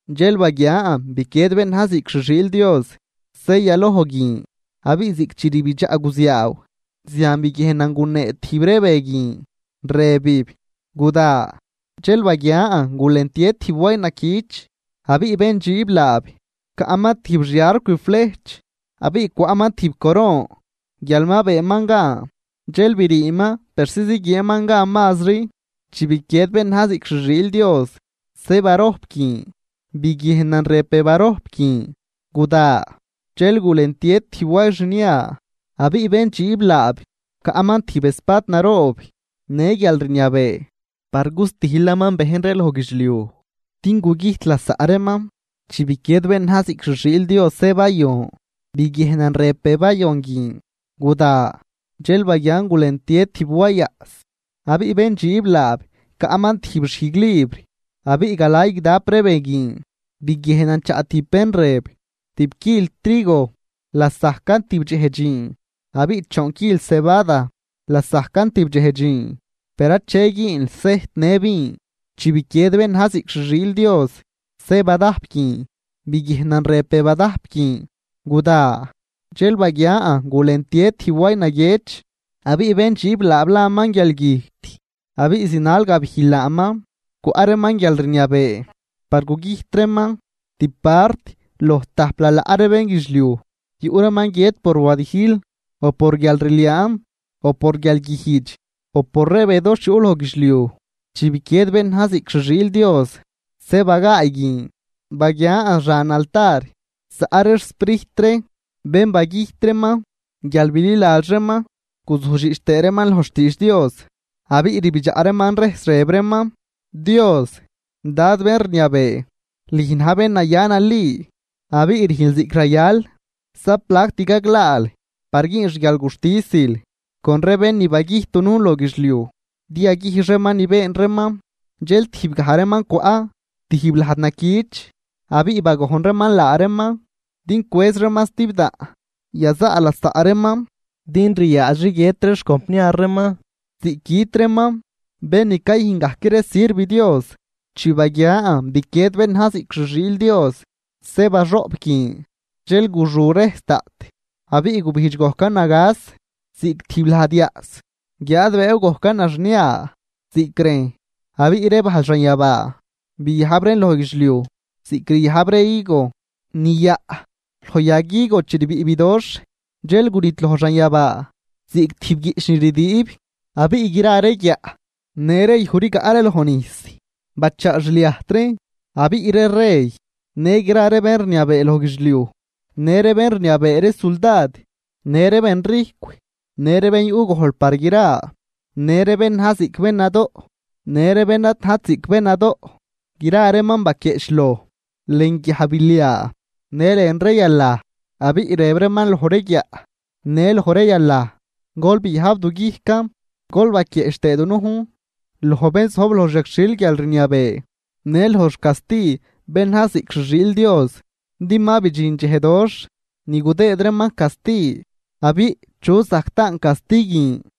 Dxel baguian biquied bén na̱j ziꞌc xi xiil Dios se yaloj guin, abiꞌ ziꞌc chi rbidxaꞌ guziaaw zian biguiejnan gunee tijb ree be guin, rëbib: ―¡Guda! Dxel baguian gulentie tijb way naquich, abiꞌ bén dxiib laab caꞌman tijb xi arcw flejch. Abiꞌ cwaꞌman tijb coron guial ma beenman gan, dxel briiman persi ziguieenman gan mazri. Chi biquied bén na̱j ziꞌc xi xiil Dios se barojp guin biguiejnan rëb be barojp guin: ―¡Guda! Dxel gulentie tijb way xnia, abiꞌ bén dxiib laab caꞌman tijb espad naroob në guialrniabee par gustijlaman bejn ree loj guidxliuj din gugüjt lasaꞌ reeman. Chi biquied bén na̱j ziꞌc xi xiil Dios se bayon, biguiejnan rëb be bayon guin: ―¡Guda! Dxel baguian gulentie tijb way yaꞌs, abiꞌ bén dxiib laab caꞌman tijb xijglibr. Abiꞌ galay guidap ree be guin biguiejnan chaꞌ tijb bén rëb: ―Tib quil trigo lasajcan tib dxej dxiin abiꞌ choon quil cebada lasajcan tibdxej dxiin, per ache güünl sejt në vin. Chi biquied bén na̱j ziꞌc xi xiil Dios se badajp guin, biguiejnan rëb be badajp guin: ―¡Guda! Dxel baguian gulentie tijb way naguiëch, abiꞌ bén dxiib laab laman guialgüjt, abiꞌ zinal gabijl laaman. Cwaꞌ reeman guialrniabee par gugüjt reeman tib part loj tajp lalaꞌ ree bénguidxliuj. Yuꞌ reeman guiët por wadijl, o por guialrliaan, o por guialguijdx, o por ree be doxh yuꞌ loj guidxliuj. Chi biquied bén na̱j ziꞌc xi xiil Dios se bagaay guin, baguian xan altar zaꞌ ree xsprijt ree bén bagüjt reeman guial bililadx reeman guzujdxiꞌch tëë reeman loj xtiidx Dios. Abiꞌ rbidxaꞌ reeman rejs rëb reeman: ―Dios, Dad bén rniabee, lüj na̱j bén naya nali abiꞌ rüjnl ziꞌc rayal, ¿za plact gaglaal par güün xguialguxtisil con ree bén ni bagüjt dunujn loj guidxliuj din yaguijx reeman ni been reeman? Dxel tijb gaj reeman cwaꞌ tijb lajd naquich, abiꞌ bagojn reeman laa reeman din cwëz reeman stibdaꞌn yazaꞌ lasaꞌ reeman, din ryaadxri guiët ree xcompniar reeman ziꞌc güt reeman, bén ni cayüjn gajc ree sirv Dios. Chi baguian biquied bén na̱j ziꞌc xi xiil Dios se baxoꞌp guin, dxel guxu rejs daꞌt abiꞌ gubijdx gojcan nagas ziꞌc tijb lajd yaꞌs. Guiáad bëëw gojcan naxnia ziꞌc rejn, abiꞌ ree bajl xanyabaa biajb reen loj guidxliuj ziꞌc ryajb ree higo ni yaꞌ loj yag higo chi rbiꞌ bidoxh. Dxel gunidloj xanyabaa ziꞌc tijb guiꞌch ni rdüüb, abiꞌ gra ree guiaꞌ në ree yuj rigaꞌ ree loj nijs bachaa xliajt reen. Abiꞌ ree rey në gra ree bén rniabee loj guidxliuj, në ree bén rniabee ree suldad në ree bén rijcw, në ree bén yuꞌ gojl par gra, në ree bén na̱j ziꞌc bén nadoꞌ, në ree bén ad najt ziꞌc bén nadoꞌ, gra reeman baquieꞌchloj lën guiajbiliaa në lën ree yalaj. Abiꞌ rëb reeman loj ree guiaꞌ në loj ree yalaj: ―Gol biajb du guijcan, gol baquieꞌch tëë dunujn loj bén zojb loj xyagxhil guialrniabee në loj xcasti bén na̱j ziꞌc xi xiil Dios, din ma bidxin dxej doxh ni gudëëd reeman casti, abiꞌ, ¿chu zajc taan casti guin?